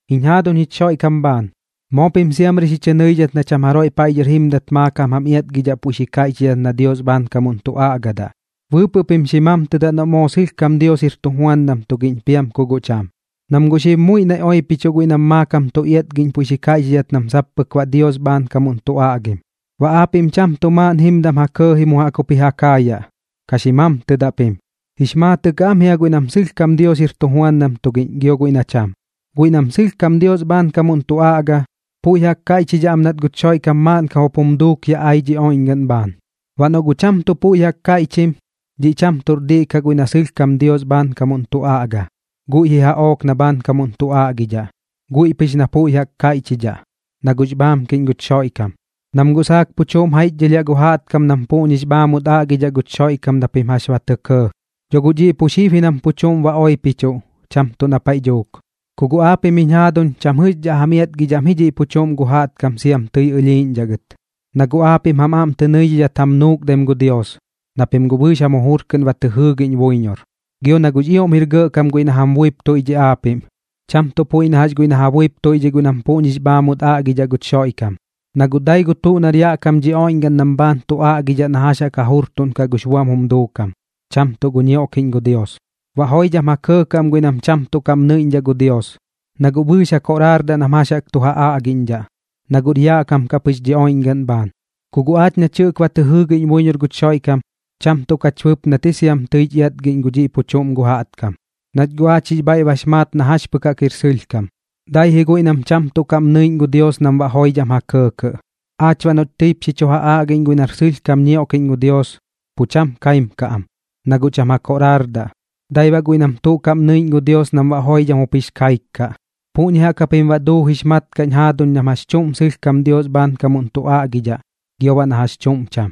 Jiñ jaaduñ jich Xoiꞌkam bhaan, moo pim siamri xi chɨ nɨidhat na cham jaroiꞌ paiꞌ dhɨr jimdat maakam jam iatgidhaꞌ puiꞌ xi kaiꞌchidhat na Dios bhaankamuꞌn tu aꞌgadaꞌ. Bɨɨpɨꞌ pim xi mamtɨdaꞌ noꞌ moo sɨlhkam Dios jir tujuandam tugiꞌñ piam ku guꞌ cham, nam guꞌ xib muiꞌ naiꞌ oipichuꞌ guiꞌ nam maakam tu iatgiꞌñ puiꞌ xi kaiꞌchidhat nam sap pɨk baꞌ Dios bhaankamuꞌn tu aꞌgim. Baꞌ aapiꞌm cham tuꞌ maaꞌn jimdam ja kɇɇji mu jaꞌk jup ji ja kaayaꞌ, ka xi mamtɨdaꞌ pim. Jix maatɨꞌ kaꞌ am jia guiꞌ nam sɨlhkam Dios jir tujuandam tugiꞌñ gio guiꞌ na cham. Guiꞌ nam sɨlhkam Dios bhaankamuꞌn tu aꞌga, puiꞌ jaꞌk kaiꞌchidhaꞌ am nat guch Xoiꞌkam maaꞌnkam jup jum duuk yaꞌ ai dhi oiꞌñgaꞌn bhaan. Baꞌ noꞌ guꞌ cham tuꞌ puiꞌ jaꞌk kaiꞌchim, dhiꞌ cham tuꞌr diꞌ kaꞌ guiꞌ na sɨlhkam Dios bhaankamuꞌn tu aꞌga, guiꞌ ji jaꞌook na bhaankamuꞌn tu aꞌgidhaꞌ, guiꞌ pɨx na puiꞌ jaꞌk kaiꞌchidhaꞌ, na guꞌx bhaamkiꞌñ guch Xoiꞌkam. Nam guꞌ saak pu chuꞌm jaiꞌchdhɨlhiaꞌ gu jaꞌtkam nam puꞌñix bhaamut aꞌgidhaꞌ guch Xoiꞌkam na pim jax ba tɇ kɇɇ. Dho guꞌ dhiꞌ pu xib ji nam pu chuꞌm ba oipichuꞌ, cham tuꞌ na paiꞌ dhuuk. Ku guꞌ aapiꞌm jiñ jaaduñ, cham jɨꞌxdhaꞌ jam iatgidhaꞌm ji dhiꞌ pu chuꞌm gu jaꞌtkam sia kum tɨi ɨlhiiꞌñdhaꞌ gɨt, na guꞌ aapiꞌm jam aꞌm tɨ nɨidhidhat jam nuukdaim gu Dios, na pim guꞌ bɨɨx jam jujur kɨꞌn ba tɨ jɨɨgiꞌñ buiñor. Gio na guꞌx ioꞌm jir gɇꞌkam guiꞌ na jam buip tuiꞌdhiꞌ aapiꞌm, cham tuꞌ puiꞌ na jax guiꞌ na ja buip tuiꞌdhiꞌ guiꞌ nam puꞌñix bhaamut aꞌgidhaꞌ guch Xoiꞌkam. Na guꞌ dai gu tuꞌ nar yaꞌ kam dhi oiꞌñgaꞌn nam bhaan tu aꞌgidhaꞌ na jax jaꞌk ja jurtuꞌnkaꞌ gux buam jum duukam, cham tuꞌ gu ñioꞌkiꞌñ gu Dios. Baꞌ joidham ja kɇɇkɇꞌ am guiꞌ nam cham tuꞌ kaꞌm nɨiꞌñdhaꞌ gu Dios, na guꞌ bɨɨx ja koꞌraardaꞌ nam jax jaꞌk tu ja aꞌgiꞌñdhaꞌ, na guꞌr yaꞌ kam kaꞌ pɨx dhi oiꞌñgaꞌn bhaan. Ku guꞌ aach nach jɨꞌk ba tɨ jɨɨgiꞌñ buiñor guch Xoiꞌkam, cham tuꞌ kach bɨpnat ji siam jax tɨich iatgiꞌñ gu dhiꞌ pu chuꞌm gu jaꞌtkam, nach guꞌ aach jix bhaiꞌ bax maat na jax pɨk jaꞌk jir sɨlhkam, dai ji guiꞌ nam cham tuꞌ kaꞌm nɨiꞌñ gu Dios nam baꞌ joidham ja kɇɇkɇꞌ. Aach baꞌ noꞌch tɨip xi chu ja aꞌgiꞌñ guiꞌ nar sɨlhkam ñioꞌkiꞌñ gu Dios, pu cham kaim kaꞌ am, na guꞌ cham ja koꞌraardaꞌ, dai baꞌ guiꞌ nam tuꞌ kaꞌm nɨiꞌñ gu Dios nam baꞌ joidham jup jix kaik kaꞌ. Puꞌñi jaꞌk japim baꞌ duujix mat kaꞌ jiñ jaaduñ nam jax chuꞌm sɨlhkam Dios bhaankamuꞌn tu aꞌgidhaꞌ gio baꞌ na jax chuꞌm cham.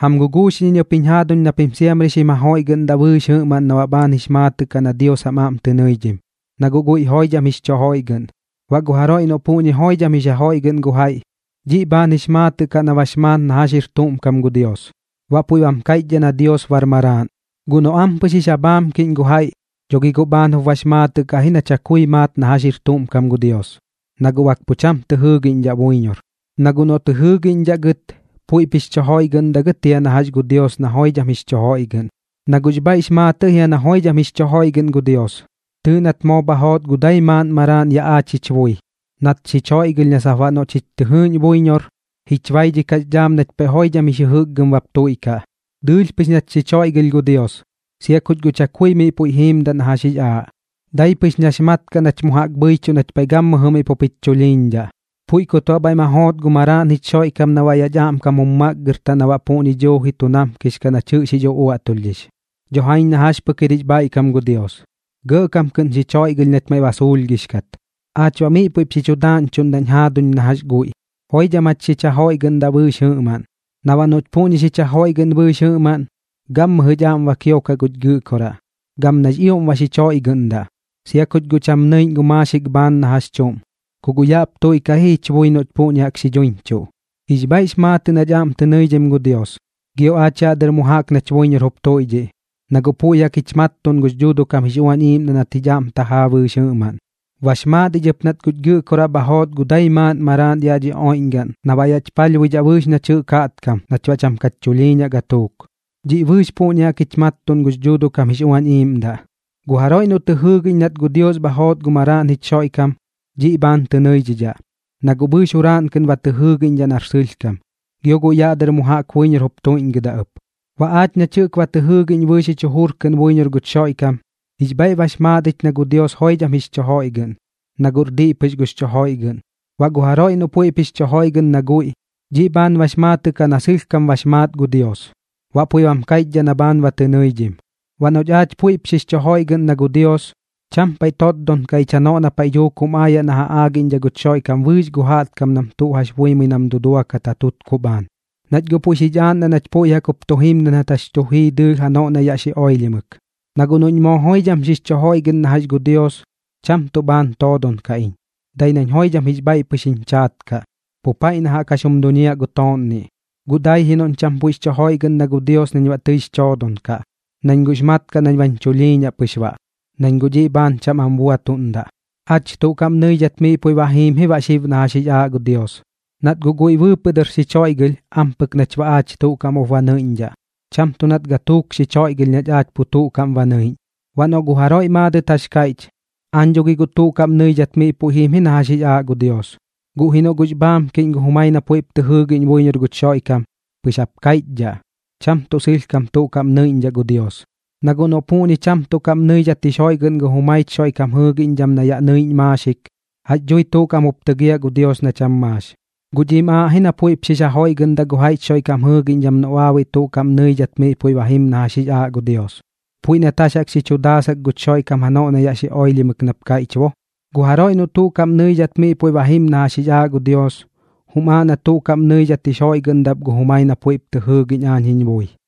Jam guguuxiꞌñ iñ ɨp jiñ jaaduñ na pim siamri xim jajoiꞌgɨꞌndaꞌ bɨɨx jɨꞌmaꞌn na baꞌ bhaan jix maatɨꞌ kaꞌ na Dios jam aꞌm tɨ nɨidhim, na guꞌ guiꞌ joidham jix chu joiꞌgɨꞌn. Baꞌ gu jaroiꞌ noꞌ puꞌñi joidham jix ja joiꞌgɨꞌn gu jaiꞌ, dhiꞌ bhaan jix maatɨꞌ kaꞌ na bax maat na jax jir tuꞌm kam gu Dios, baꞌ puiꞌ bam kaiꞌchdhaꞌ na Dios bar Maraaꞌn. Guꞌ noꞌ ampɨx jix ja bhaamkiꞌñ gu jaiꞌ, dho gi guꞌ bhaan jup bax maatɨꞌ kaꞌ ji na pu chakui maat na jax jir tuꞌm kam gu Dios, na guꞌ bak pu cham tɨ jɨɨgiꞌñdhaꞌ buiñor. Na guꞌ noꞌ tɨ jɨɨgiꞌñdhaꞌ gɨt, puiꞌp jix chu joiꞌgɨꞌndaꞌ gɨt jia na jax gu Dios na joidham jix chu joiꞌgɨꞌn. Na guꞌx bhaiꞌx maatɨꞌ jia na joidham jix chu joiꞌgɨꞌn gu Dios. Tɨɨꞌ nat moo bha joot gu dai maaꞌn Maraaꞌn yaꞌ aach jich bui, nat xich joiꞌgɨlh na sap baꞌ noꞌ chich tɨ jɨɨꞌñ buiñor, jich baidhikaꞌx dhaam nach paiꞌ joidham jix jɨjɨkgɨm bap tuiꞌkaꞌ. Dɨɨlh pɨx nat xich joiꞌgɨlh gu Dios, sia kuch chakui miꞌ puiꞌ jiimdaꞌ na jax jix aaꞌ, dai pɨx nax mat kaꞌ nach mu jaꞌk bhɨichuꞌn nach paiꞌ gammɨjɨ miꞌ pup jich chulhiiñdhaꞌ. Puiꞌ kut baꞌ bhaiꞌ ma joot gu Maraaꞌn jich Xoiꞌkam na yaꞌch aꞌmkam jum makgɨrtaꞌ na baꞌ puꞌñi duuji tu namkix kaꞌ nach jɨꞌx jix uꞌuaꞌtulhdhix. Dho jaiñ na jax pɨk jir jix bhaiꞌkam gu Dios, gɇꞌkam kɨꞌn xich joiꞌgɨlh nach maiꞌ ba suulhgix kat. Aach baꞌ miꞌ puiꞌp xi chu daaꞌñchuꞌndaꞌñ jaaduñ na jax guiꞌ, joidham jach xich jajoiꞌgɨꞌndaꞌ bɨɨx jɨꞌmaꞌn. Na baꞌ noꞌch puꞌñi xich jajoiꞌgɨꞌn bɨɨx jɨꞌmaꞌn, gammɨjɨch aꞌm ba kiokaꞌ guch Gɨꞌkoraꞌ, gam nax ioꞌm ba xich joiꞌgɨꞌndaꞌ. Sia kuch guꞌ cham nɨiꞌñ gu maaxik bhaan na jax chuꞌm, ku guꞌ yaꞌp tuiꞌkaꞌ ji jich bui noꞌch puꞌñi jaꞌk xi dhuiñchuꞌ. Jix bhaiꞌx maatɨꞌ nach aꞌm tɨ nɨidhim gu Dios, gio aach yaꞌ dɨr mu jaꞌk nach buiñor jup tuiꞌdhiꞌ, na guꞌ puiꞌ jaꞌk jich mattuꞌn gux Dhuuduꞌ kam jix Uañ Iiꞌmdaꞌ nat jich aꞌm tajaa bɨɨx jɨꞌmaꞌn. Bax maat ich ɨp nat guch Gɨꞌkoraꞌ bha joot gu dai maaꞌn Maraaꞌn yaꞌ dhi oiꞌñgaꞌn na baꞌ yaꞌch palhbuidhaꞌ bɨɨx nach jɨꞌk jaꞌtkam nach baꞌ cham kach chulhiiñaꞌ gatuuk. Dhiꞌ bɨɨx puꞌñi jaꞌk jich mattuꞌn gux Dhuuduꞌ kam jix Uañ Iiꞌmdaꞌ. Gu jaroiꞌ noꞌ tɨ jɨɨgiꞌñ nat gu Dios bha joot gu Maraaꞌn jich Xoiꞌkam, dhiꞌ bhaan tɨ nɨidhidhaꞌ, na guꞌ bɨɨx juraaꞌn kɨꞌn ba tɨ jɨɨgiꞌñdhaꞌ nar sɨlhkam, gio guiꞌ yaꞌ dɨr mu jaꞌk buiñor jup tuiꞌñgɨdaꞌ ɨp. Baꞌ aach nach jɨꞌk ba tɨ jɨɨgiꞌñ bɨɨx jich jujur kɨꞌn buiñor guch Xoiꞌkam, jix bhaiꞌ bax maat ich na gu Dios joidham xich joiꞌgɨꞌn, na guꞌr diꞌ pɨx gux chu joiꞌgɨꞌn. Baꞌ gu jaroiꞌ noꞌ puiꞌp jix chu joiꞌgɨꞌn na guiꞌ, dhiꞌ bhaan bax maatɨꞌ kaꞌ na sɨlhkam bax maat gu Dios, baꞌ puiꞌ bam kaiꞌchdhaꞌ na bhaan ba tɨ nɨidhim. Baꞌ noꞌch aach puiꞌp jix chu joiꞌgɨꞌn na gu Dios, cham paiꞌ totdon kaꞌ ich janoꞌ na paiꞌ dhuuk jum aayaꞌ na ja aagiꞌñdhaꞌ guch Xoiꞌkam bɨɨx gu jaꞌtkam nam tuꞌ jax buimɨi nam duduakat ja tutkuꞌ bhaan, nach guꞌ puiꞌ xich aaꞌndaꞌ nach puiꞌ jaꞌk jup tu jimdat nat jax tu jii dɨɨlh janoꞌ na yaꞌ xi oilhimɨk. Na guꞌ noꞌñ moo joidham xix chu joiꞌgɨꞌn na jax gu Dios, cham tuꞌ bhaan toodon kaꞌ iñ, dai nañ joidham jix bhaiꞌ pɨx jiñ chaat kaꞌ, pu paiꞌ na jaꞌk jax jum duñiaꞌ gu tooꞌnniꞌ. Guꞌ dai ji noꞌñ cham puiꞌp jix chu joiꞌgɨꞌn na gu Dios nañ baꞌ tɨix choodon kaꞌ, nañ guꞌx mat kaꞌ nañ bañ chulhiiñaꞌ pɨx baꞌ, nañ guꞌ dhiꞌ bhaan cham am buatuꞌndaꞌ. Aach tuꞌ kaꞌm nɨidhat miꞌ puiꞌ ba jiim ji baꞌ xib na jax jix aaꞌ gu Dios, nat guꞌ guiꞌ bɨɨpɨꞌ dɨr xich joiꞌgɨlh ampɨk nach baꞌ aach tuꞌ kaꞌm jup ba nɨiꞌñdhaꞌ, cham tuꞌ nat gatuuk xich joiꞌgɨlh nach aach pu tuꞌ kaꞌm ba nɨiꞌñ. Baꞌ noꞌ guꞌ jaroiꞌ maadɨt jax kaiꞌch: “Aañ dho gi tuꞌ kaꞌm nɨidhat miꞌ puiꞌ jim ji na jax jix aaꞌ gu Dios”, guꞌ ji noꞌ guꞌx bhaamkiꞌñ gu jumai na puiꞌp tɨ jɨɨgiꞌñ buiñor guch Xoiꞌkam, pɨx jap kaiꞌchdhaꞌ, cham tuꞌ sɨlhkam tuꞌ kaꞌm nɨiꞌñdhaꞌ gu Dios. Na guꞌ noꞌ puꞌñi cham tuꞌ kaꞌm nɨidhat jix joiꞌgɨꞌn gu jumaich Xoiꞌkam jɨɨgiꞌñdham na yaꞌ nɨiꞌñ maaxik, ¿jax dhui tuꞌ kaꞌm jup tɨgiaꞌ gu Dios na cham maax? Guꞌ dhiꞌm aaꞌ ji na puiꞌp xix jajoiꞌgɨꞌndaꞌ gu jaiꞌch Xoiꞌkam jɨɨgiꞌñdham noꞌ baabuiꞌ tuꞌ kaꞌm nɨidhat miꞌ puiꞌ ba jim na jax jix aaꞌ gu Dios, puiꞌ nat jax jaꞌk xi chu daasak guch Xoiꞌkam janoꞌ na yaꞌ xi oilhimɨk nap kaiꞌch bo: “Gu jaroiꞌ noꞌ tuꞌ kaꞌm nɨidhat miꞌ puiꞌ ba jim na jax jix aaꞌ gu Dios, jum aaꞌ na tuꞌ kaꞌm nɨidhat jix joiꞌgɨꞌndaꞌ ɨp gu jumai na puiꞌp tɨ jɨɨgiꞌñ aañ jiñ bui.”